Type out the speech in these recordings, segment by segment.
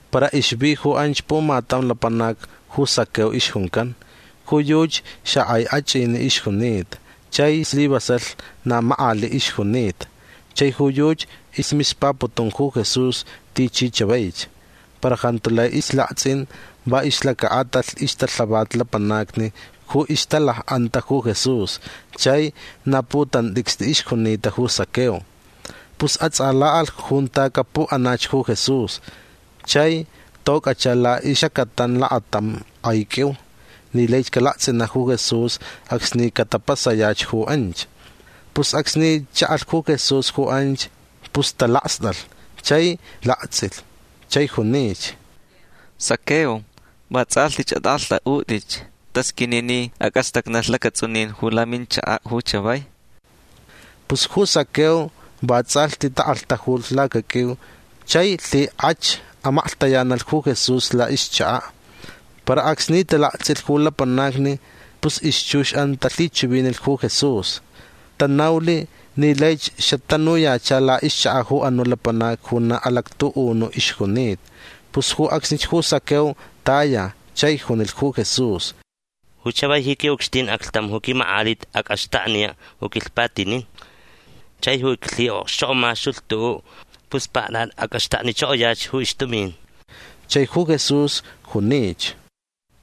Para ixvi ju anch pumatam lapanac ju Zaqueo ixjuncan. Ju yuchi xakʼai achʼiniʼ ixjunita chai slivasalh na makʼaliʼ ixjunita. Chai ju yuchi ismispaputun ju Jesús tichi chavaich. Para jantu lai islaktsʼin va ixlacaʼatalh ixtalhavat lapanacni ju ixtalakʼanta ju Jesús chai na putantʼicstʼi ixjunita ju Zaqueo. Pus atsʼalaʼalh junta capuʼanach ju Jesús. Chai tocʼacha laʼixʼacatan lakatam kʼai qʼuiu ni laich calaktsʼinaʼ ju Jesús acsni catapasayach ju anch. Pus acsni chaʼalh ju Jesús ju anch pus talakstʼalh chai laktsʼilh chai junich: ―Zaqueo vatsʼalhtich atʼakʼalhtʼaʼutʼich. Tasqʼuini ni acʼastacnalh lacatsʼunin ju laminchakaʼ ju chavai. Pus ju Zaqueo vatsʼalhti takʼalhtajulh lacaqʼuiu chai lhikʼach amaklhtayanalh ju Jesús laʼixchakaʼ. Para acsni talaktsʼilh ju lapanacni pus ixchuxʼan talhichivinilh ju Jesús. Tanaulh ni laich xatanuyacha laʼixchakaʼ ju anuʼ lapanac ju na alactuʼunuʼ ixjunita. Pus ju acsnich ju Zaqueo taya chai junilh ju Jesús: ―Ju chavai ji quiʼucxtin aclhtam ju quimakʼalit acʼaxtakniyach ju quilhpatinin. Chai ju iclhiʼokxchokʼomaxtulh tuʼuʼ pus paktʼatʼi acʼaxtaknichokoyach ju ixtumin. Chai ju Jesús junich: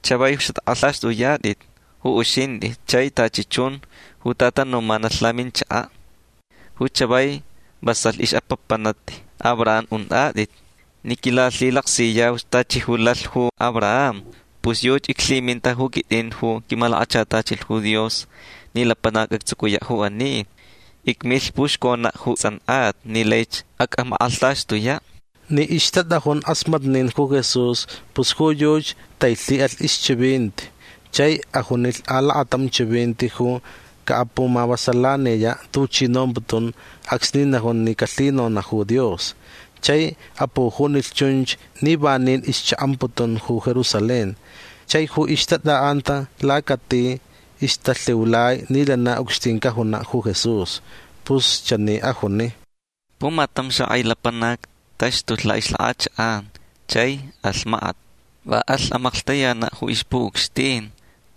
―Chavai xatʼakʼalhtʼaxtʼuyatʼit ju uxintʼi chai tachi chun ju tatanumanalh laminchakaʼ. Ju chavai vasalh ixpapanti Abraham untʼatʼit ni quilalhilaksiyauch tachi ju lalh ju Abraham. Pus yuchi iclhiminta ju quitʼin ju quimalakachatachilh ju Dios ni lapanac actsucuyaʼ ju ani. Icmilh puxconaʼ ju tsʼankʼata ni laich acʼamakʼalhtaxtuyaʼ. Ni ixtatʼajun kʼasmatnin ju Jesús pus ju yuchi tailhiʼalh ixchivinti chai ajunilh alakatam chivinti ju caʼapumavasalaniyaʼ tuchi nomputun acsni najun ni calhinonaʼ ju Dios. Chai apujunilh chunch ni vanin ixchaʼamputun ju Jerusalén chai ju ixtatʼaʼanta lacati ixtalhiulai ni lana ucxtin cajunaʼ ju Jesús. Pus chani ajuni: ―Pumatam xakʼai lapanac taxtulh laʼixlakʼachakʼan chai alh makat. Va alh amaklhtayanaʼ ju ixpuʼucxtin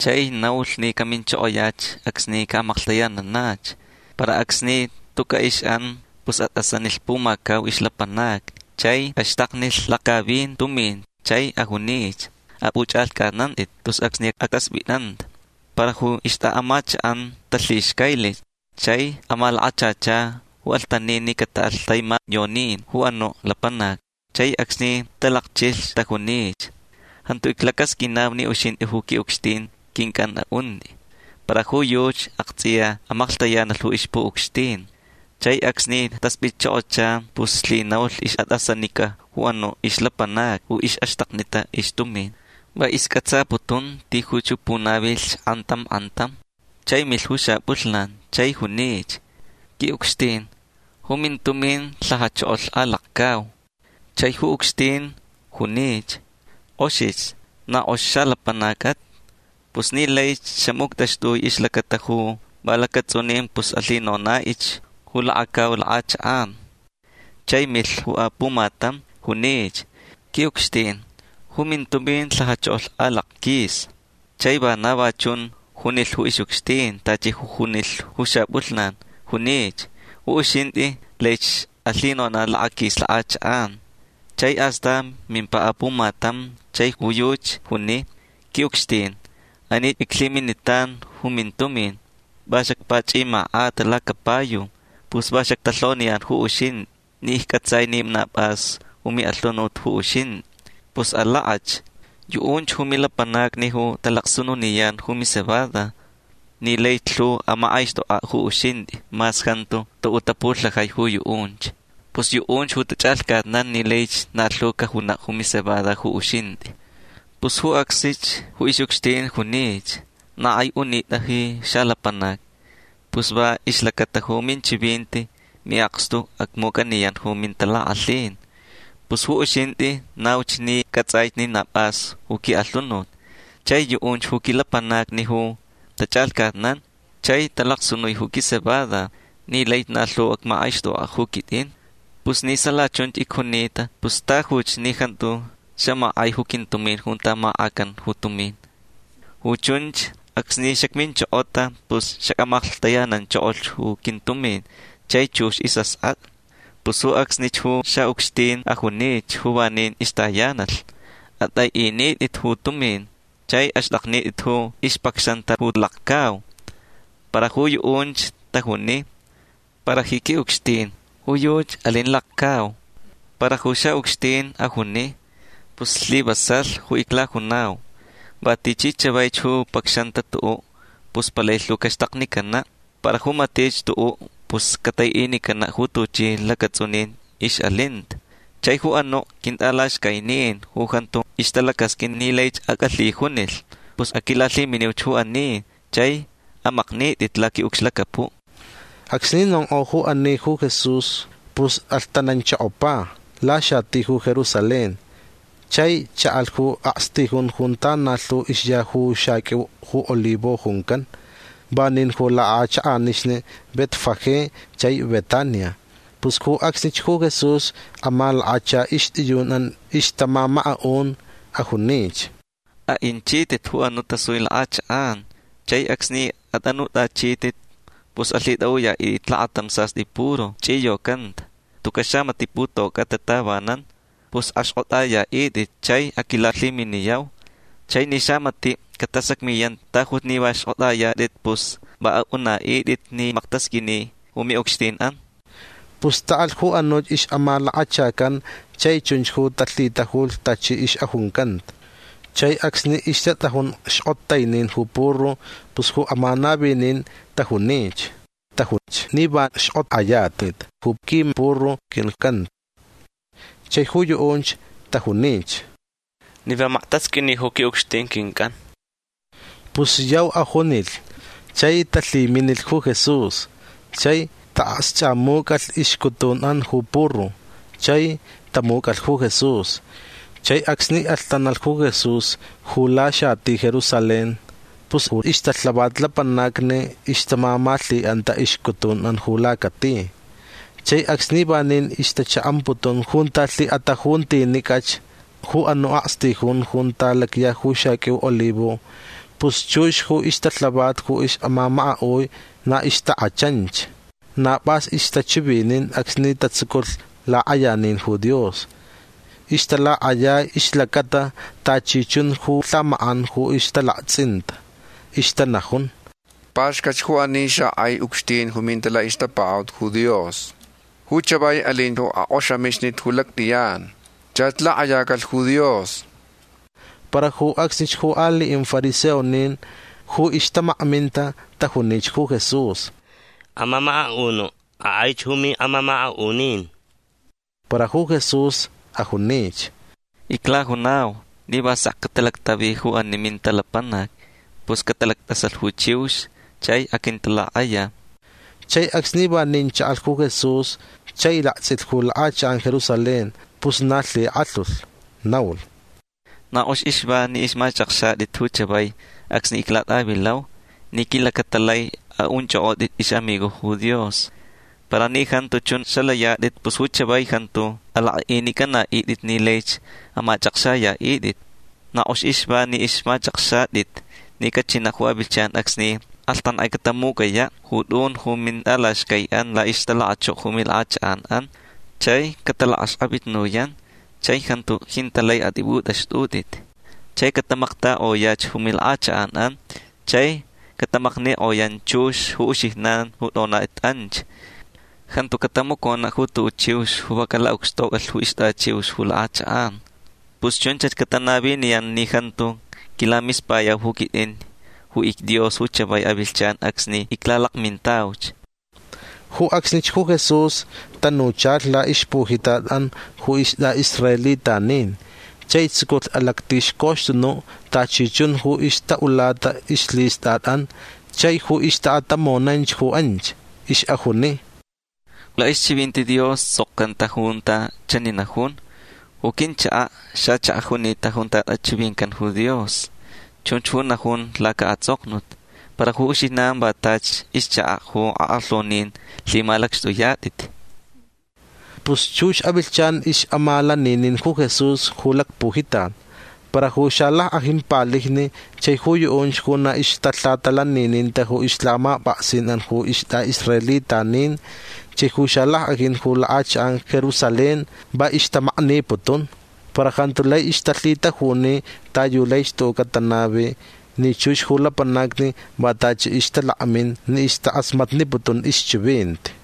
chai naulh ni caminchokoyach acsni caʼamaklhtayananach. Para acsni tucaʼ ixʼan pus atʼasanilh pumacau ixlapanacni chai axtaknilh lakcavin tumin chai ajunich: “Apʼuchʼalhcʼatnantʼit tus acsni actaspʼitʼanta”. Para ju ixtʼaʼamachakʼan talhixcailich chai amalakachacha ju alhtanin ni cataʼalh taimayonin ju anuʼ lapanac. Chai acsni talakchilh tajunich: “Jantu iclacasqʼuinau ni uxintʼi ju quiʼucxtin quincʼan aʼuntʼi”. Para ju yuchi aktsʼiya amaklhtayanalh ju ixpuʼucxtin. Chai acsni taspʼitchokocha pus lhinaulh ixʼatʼasanica ju anuʼ ixlapanacni ju ixʼaxtaknita ixtumin. Va iscʼatsaputun tijuch ju punavilh kʼantam kʼantam. Chai milh ju xapʼulhnan chai junich: “Quiʼucxtin ju mintumin lhajachokolh alakcau”. Chai ju ucxtin junich: “Kʼoxich. Na kʼox xalapanacʼat. Pus ni laich xamuctʼaxtʼui ixlacata ju va lacatsʼunin pus alhinonaʼich ju lakacau lakʼachakʼan”. Chai milh ju apumatam. Junich: “Quiʼucxtin ju mintumin lhajachokolh alakquis”. Chai vana va chunch ju junilh ju ixʼucxtin tachi ju junilh ju xapʼulhnan. Junich: “Ju uxintʼi laich alhinonaʼ lakaquis lakʼachakʼan”. Chai astan mimpa apumatam chai ju yuchi juni: “Quiʼucxtin anich iclhiminitan ju mintumin. Va xacpachʼimakʼata lacapayu. Pus va xactalhoniyan ju uxintʼi ni iccʼatsaich ni na pʼas ju miʼalhunut ju uxintʼi. Pus alakʼach. Yuʼunch ju milapanacni ju talacsununiyan ju micebada ni laich lhu amakʼaixtʼokʼaʼ ju uxintʼi mas jantu tuʼuʼ tapulhajai ju yuʼunch. Pus yuʼunch ju tachʼalhcatnan ni laich na lhu cajunaʼ ju micebada ju uxintʼi”. Pus ju acsnich ju ixʼucxtin junich: “Na kʼai unitʼa ji xalapanac. Pus va ixlacata ju minchivinti miʼakstu ju acmucʼaniyan ju mintalakʼalhin. Pus ju uxintʼi nauch ni cʼatsʼaich ni na pʼas ju quiʼalhunut. Chai yuʼunch ju quilapanacni ju tachʼalhcatnan chai talacsunui ju quicebada ni lai na lhu acmakʼaixtʼokʼaʼ ju quitʼin. Pus ni sala chunch icjunita pus tajuch ni jantu xamakʼai ju quintumin junta makʼacan ju tumin. Ju chunch acsni xacminchokota pus xacʼamaklhtayananchokolh ju quintumin chai chux ju isʼaskʼatʼa”. Pus ju acsnich ju xaʼucxtin ajunich ju vanin ixtayanalh: “Atʼaiʼinitʼit ju tumin chai axtʼaknitʼit ju ixpacxanta ju lakcau”. Para ju yuʼunch tajuni: “Para ji quiʼucxtin ju yuchi alin lakcau”. Para ju xaʼucxtin ajuni: “Pus islivasalh ju iclajunau. Va tichi chavaich ju pacxanta tuʼuʼ pus palai lhu caxtaknicanaʼ. Para ju matich tuʼuʼ pus cataiʼinicanaʼ ju tuchi lacatsʼunin ixʼalinta. Chai ju anuʼ quintʼalaxcainin ju jantu ixtalacasqʼuin ni laich acʼalhijunilh pus aquilalhiminiuch ju ani chai amaknitʼit laquiʼucxlacapuʼ”. Acsni nonkʼo ju ani ju Jesús pus alhtananchokopa laxati ju Jerusalén. Chai chaʼalh ju akstijun junta na lhu ixya ju xaqʼuiu ju olivo juncan. Vanin ju lakʼachakʼanixni Betfagé chai Betania. Pus ju acsnich ju Jesús amalakacha ixtʼiyunʼan ixtamamakaʼun. Ajunich: ―Aʼinchitʼit ju anuʼ tasui lakʼachakʼan chai acsni atʼanutʼachitʼit pus alhitʼaʼuyaʼitʼit lakatam sastʼi puru chʼiyocanta. Tucaʼ xamatiʼ putocʼata tavanan. Pus axkʼotʼayaʼitʼit chai aquilalhiminiyau. Chai ni xamatiʼ catasacmiyan tajuch ni va xkʼotʼayatʼit pus va aʼunaʼitʼit ni maktasqʼuini ju miʼucxtinʼan. Pus taʼalh ju anuch ixʼamalakachacan chai chunch ju talhitajulh tachi ixʼajuncanta. Chai acsni ixtatʼajun xkʼotainin ju puru pus ju amanavinin tajunich: ―Tajuch ni va xkʼotʼayatʼit ju quimpuru quincʼan. Chai ju yuʼunch tajunich: ―Ni va maktasqʼuini ju quiʼucxtin quincʼan. Pus yau ajunilh chai talhiminilh ju Jesús. Chai taʼakxchʼamucʼalh ixcutunʼan ju puru. Chai tamucʼalh ju Jesús. Chai acsni alhtanalh ju Jesús ju laxati Jerusalén pus ju ixtalhavat lapanacni ixtamamalhiʼanta ixcutunʼan ju lacati. Chai acsni vanin ixtachaʼamputun junta lhiʼatajuntinicʼach ju anuʼ akstijun junta lacya ju xaqʼuiu olivo pus chux ju ixtalhavat ju ixʼamamakaʼui na ixtakʼachanch. Na pʼas ixtachivinin acsni tatsuculh lakʼayanin ju Dios. Ixtalakʼayai ixlacata tachi chun ju lhamakʼan ju ixtalaktsʼinta. Ixtanajun: ―Paxcat ju ani xakʼai ucxtin ju minta laʼixtapakaʼut ju Dios. Ju chavai alin ju akʼoxamixnit ju lactʼiyan. Chach lakʼayacalh ju Dios. Para ju acsnich ju aliʼin fariseonin ju ixtamakminta tajunich ju Jesús: ―Amamakaʼunuʼ akʼaich ju miʼamamakaʼunin. Para ju Jesús ajunich: ―Iclajunau ni va sek catalactavi ju ani minta lapanacni pus catalactʼasalh ju chiux chai aquintalakʼaya. Chai acsni vanin chaʼalh ju Jesús chai laktsʼilh ju lakʼachakʼan Jerusalén pus na lhikʼalhulh. Naulh: ―Na kʼox ixva ni ixmachʼakxatʼit ju chavai acsni iclatʼavilau ni quilacata lai aʼunchʼokʼotʼit ixʼamigojni ju Dios. Para ni jantu chun xalayatʼit pus ju chavai jantu alakʼaʼinicʼanaʼitʼit ni laich amachʼakxayaʼitʼit. Na kʼox ixva ni ixmachʼakxatʼit ni cachinaʼ ju avilhchan acsni kʼalhtankʼai catamucʼayaʼ ju tʼun ju mintʼalaxcaiʼan laʼixtalakachoko ju milakʼachakʼanʼan chai catalakʼaxkʼavitnuyan chai jantu jintaʼ lai atʼipʼutʼaxtʼutʼit. Chai catamaktakʼoyach ju milakʼachakʼanʼan. Chai catamaknikʼoyan chux ju uxijnan ju tʼonatʼit anch. Jantu catamaconaʼ ju tuʼuʼ chiux ju va calaʼucxtocʼalh ju ixtʼachiux ju lakʼachakʼan. Pus chunch catanaviniyan ni jantu quilamispayau ju quitʼin ju icDios ju chavai avilhchan acsni iclalakmintauch. Ju acsnich ju Jesús tanuchalh laʼixpujitatʼan ju istʼaʼisraelitanin chai tsuculh alactixcoxtunuʼ tachi chun ju ixtaʼulata ixlhistʼatʼan chai ju ixtaʼatamonanch ju anch. Ixʼajuni: ―Laʼixchivinti Dios tsʼokcanta junta chani najun: “Ju quinchakaʼ xachakaʼ junita junta tʼachivincan ju Dios”. Chunch ju najun lacaʼatsʼoknut. Para ju uxijnan va tachi ixchakaʼ ju akʼalhaunin lhimalacxtʼuyatʼit. Pus chux avilhchan ixʼamalaninin ju Jesús ju lacpujitat. Para ju xalackʼajin palijni chai ju yuʼunch ju na ixtalhatalanininta ju ixlhamapʼaksinʼan ju istʼaʼisraelitanin chai ju xalackʼajin ju lakʼachakʼan Jerusalén va ixtamakniputun. Para jantu lai ixtalhitajuni ta yu laich tuʼuʼ catanavi ni chux ju lapanacni va tachi ixtalakmin ni ixtakʼasmatniputun ixchivinti.